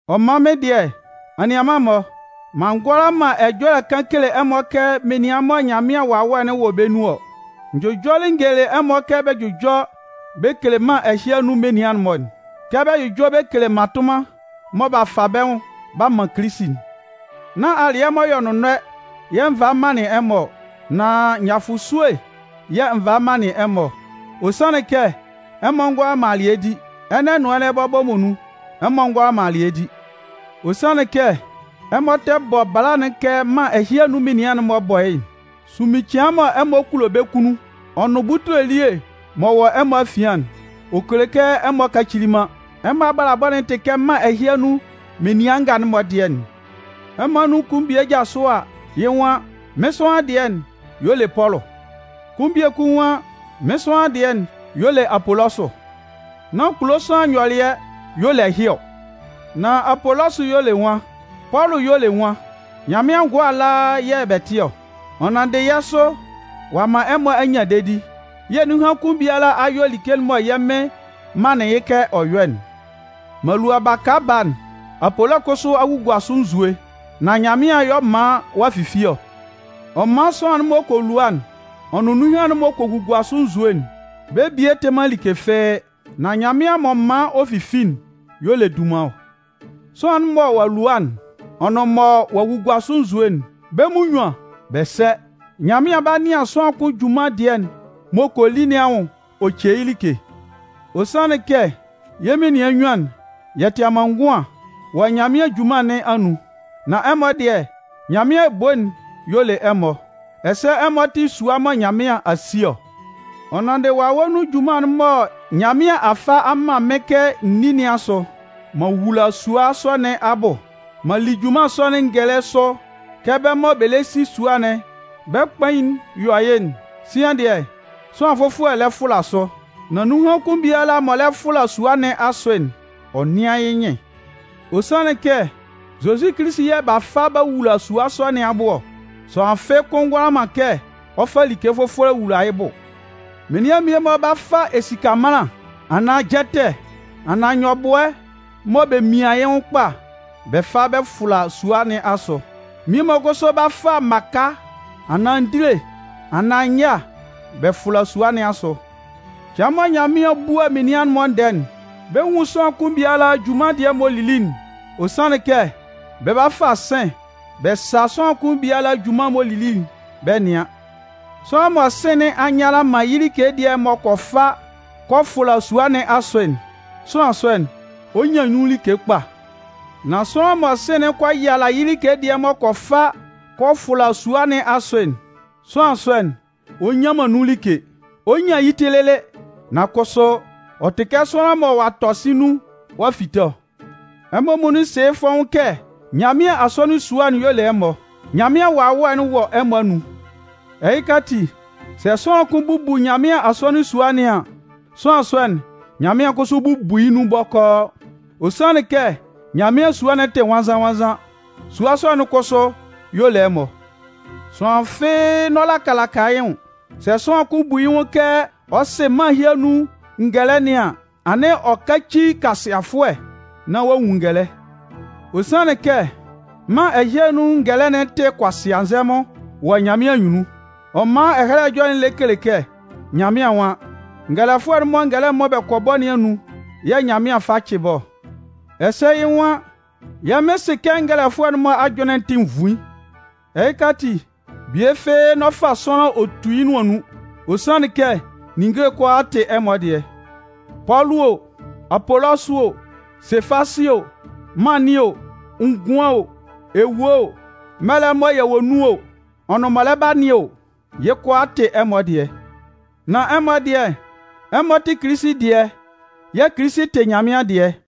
Ɔ man mɩ́n dɩɛ, anianman-mɔ, m'an ngʋala man ɛjɔlɛ kan kele ɛmɔ kɛ menian mɔ Nyanmɩan Wawɛ'n wɔ bɛ́ nun ɔ. N jʋjɔlɩ n gelelɩ ɛmɔ kɛ bɛ jʋjɔ bɛ kele mân ɛhɩ anun menian'n-mɔ'n kɛ bɛ jʋjɔ bɛ kele mmatʋnman mɔ b'a fa bɛ́ nwʋn b'a man Kilisi'n. Nán alɩɛ m'ɔ yɔ nʋnnɔɛ yɛ̂ n valɩ m manlɩn ɛmɔ ɔ. Nan nyafʋsue yɛ̂ n valɩ manlɩn ɛmɔ ɔ. Ɔ sanlɩn kɛ ɛmɔ ngʋala man alɩɛ di. Ɛnɛ nʋn ɛnɛ bɔbɔ muonun, ɛmɔ ngʋala man alɩɛ di. Ɔ sanlɩn kɛ ɛmɔ tɛ bɔ bɛ́ bala'n kɛ mân ɛhɩ anun menian'n-mɔ bɔ yɩ́'n. Sunmin cɩan'n mɔ ɛmɔ kulo bɛ́ kunnun, ɔ nʋn butule elie m'ɔ wɔ ɛmɔ afian'n, ɔ kele kɛ ɛmɔ kacili man. Ɛmɔ abalabɔ'n tɩ kɛ mân ɛhɩ anun menian nga'n-mɔ dɩɛ'n. Ɛmɔ anun kʋn bie jasʋ a, yɩ́ nwan: “Mɩ́n sʋanlan dɩɛ'n y'ɔ le Pɔlʋ.” Kʋn biekun nwan: “Mɩ́n sʋanlan dɩɛ'n y'ɔ le Apolɔsʋ.” Nán kulo sʋanlan nyɔlɩɛ y'ɔ le ɛhɩ ɔ? Nan Apolɔsʋ y'ɔ le nwan? Pɔlʋ y'ɔ le nwan? Nyanmɩan ngʋa ala yɛ̂ yɛ tɩ ɔ. Ɔ nanndɩ yɛ́ sʋ ɔ'a man ɛmɔ a nyan dedi. Yɛ́ nunhan kʋn biala a yɔ like'n mɔ yɛ́ Mɩn manlɩn yɩ́ kɛ ɔ yɔ́'n. M'an lua baka baa'n, Apolɔsʋ kʋsʋ a gugua sʋ nzue, nan Nyanmɩan y'ɔ man ɔ'a fifi ɔ. Ɔ man sʋanlan'n m'ɔ kɔ lua'n ɔ nʋn nunhan'n m'ɔ kɔ gugua sʋ nzue'n, bɛ́ bie tɩ man like fɩ́ɩ́, nan Nyanmɩan m'ɔ man ɔ fifi'n y'ɔ le dunman ɔ. Sʋanlan'n mɔ ɔ'a lua'n ɔ nʋn mɔ ɔ'a gugua sʋ nzue'n, bɛ́ munnyuan bɛ sɛ. Nyanmɩan 'ba nɩan sʋanlan kʋn junman dɩɛ'n m'ɔ kɔ li nɩn anwʋn ɔ ce yɩ́ like. Ɔ sanlɩn kɛ, yɛ́ menian nnyuan'n, yɛ tɩ amanngʋan wɔ Nyanmɩan junman nɩn anun. Nan ɛmɔ dɩɛ, Nyanmɩan ebo'n y'ɔ le ɛmɔ. Ɛsɛ ɛmɔ tɩ sua mɔ Nyanmɩan a si ɔ. Ɔ nanndɩ Wawɛ nun junman'n mɔ Nyanmɩan a fa a man mɩ́n kɛ n ní nɩn asʋ, m'an wula sua sɔ nɩn abʋ. M'an li junman sɔ'n ngɛlɛ sʋ kɛ bɛ́ mɔ bɛ lɛ si sua'n bɛ́ kpain'n yɔ yɩ́'n. Sian dɩɛ, sʋanlan fʋfɔlɛ lɛ fʋla sʋ. Nan nunhan kʋn biala m'ɔ lɛ fʋla sua nɩn asʋ'n, ɔ nɩ́an yɩ́ nyɩn. Ɔ sanlɩn kɛ Zozi Kilisi yɛ̂ b'a fa b'a wula sua sɔ nɩn abʋ ɔ. Sʋanlan fɩ́ɩ́ kʋ́n ngʋala man kɛ ɔ fa like fʋfɔlɛ wula yɩ́ bʋ. Menian mmie-mɔ 'ba fa esika ɛmanlan, anaan jɛtɛ, anaan nyɔbʋɛ mɔ bɛ mian yɩ́ nwʋn kpa bɛ fa bɛ fʋla sua nɩn asʋ. Mmie-mɔ kʋsʋ 'ba fa mmaka anaan ndile, anaan nyâ bɛ fʋla sua nɩn asʋ. Cɩan mɔ Nyanmɩan 'bua menian'n-mɔ ndɛɛ'n, bɛ 'nwun sʋanlan kʋn biala junman dɩɛ m'ɔ lili'n. Ɔ sanlɩn kɛ, bɛ 'ba fa sɩ̂n bɛ sa sʋanlan kʋn biala junman'n m'ɔ lili'n bɛ nɩan. Sʋanlan mɔ sɩ̂n nɩn a nnyala man yɩ́ like dɩɛ m'ɔ kɔ fa kɔ fʋla sua nɩn asʋ'n, sʋanlan sɔ'n, ɔ 'nyan nun like kpa. Nan sʋanlan mɔ sɩ̂n'n kɔ yala yɩ́ like dɩɛ m'ɔ kɔ fa kɔ fʋla sua nɩn asʋ'n, sʋanlan sɔ'n, ɔ nnyan man nun like. Ɔ 'nyan yɩ́ ti lɩlɩ, nan kʋsʋ, ɔ tɩ kɛ sʋanlan mɔ ɔ'a tɔ sɩ̂n nun ɔ'a fite ɔ. Ɛmɔ muonun sɩ yɩ́ fɔ́ʋ́n kɛ Nyanmɩan asɔnɩn sua'n y'ɔ le ɛmɔ, Nyanmɩan Wawɛ'n wɔ ɛmɔ anun. Ɛhɩka ati, sɛ sʋanlan kʋn bubu Nyanmɩan asɔnɩn sua nɩn an, sʋanlan sɔ'n, Nyanmɩan kʋsʋ 'bubu yɩ́ nun bɔkɔɔ. Ɔ sanlɩn kɛ Nyanmɩan sua'n tɩ nwannzan-nwannzan. Sua sɔ'n kʋsʋ y'ɔ le ɛmɔ. Sʋanlan fɩ́ɩ́ n'ɔ laka laka yɩ́ nwʋn. Sɛ sʋanlan kʋn bu yɩ́ nwʋn kɛ ɔ sɩ mân ɛhɩ anun ngɛlɛ nɩn an, anɩn ɔ káci kʋasɩafʋɛ, nán ɔ'a nwun ngɛlɛ. Ɔ sanlɩn kɛ mân ɛhɩ anun ngɛlɛ'n tɩ kʋasɩanzɛmʋn wɔ Nyanmɩan anyunnun. Ɔ man Ɛhɛlɛ Ɛjɔlɛ'n lɛ kele kɛ Nyanmɩan nwan: Ngɛlɛfʋɛ'n-mɔ ngɛlɛ mɔ bɛ kɔ bɔ nɩn anun yɛ̂ Nyanmɩan fa cɩ bɛ́ ɔ. Ɛsɛ yɩ́ nwan: Yɛ́ Mɩn sɩ kɛ ngɛlɛfʋɛ'n-mɔ ajʋnlɩn'n tɩ nvuin. Ɛhɩka ati, bie fɩ́ɩ́ n'ɔ fa sʋanlan ɔ tu yɩ́ nʋan nun. Ɔ sanlɩn kɛ ninnge kʋalaa tɩ ɛmɔ dɩɛ. Pɔlʋ o, Apolɔsʋ o, Sefasɩ o, mân nɩn o, ngʋan o, ewue o, mɛlɛ'n mɔ yɛ wɔ nun o, ɔ nʋn m'ɔ lɛ ba nɩn o, yɩ́ kʋalaa tɩ ɛmɔ dɩɛ. Nan ɛmɔ dɩɛ, ɛmɔ tɩ Kilisi dɩɛ yɛ̂ Kilisi tɩ Nyanmɩan dɩɛ.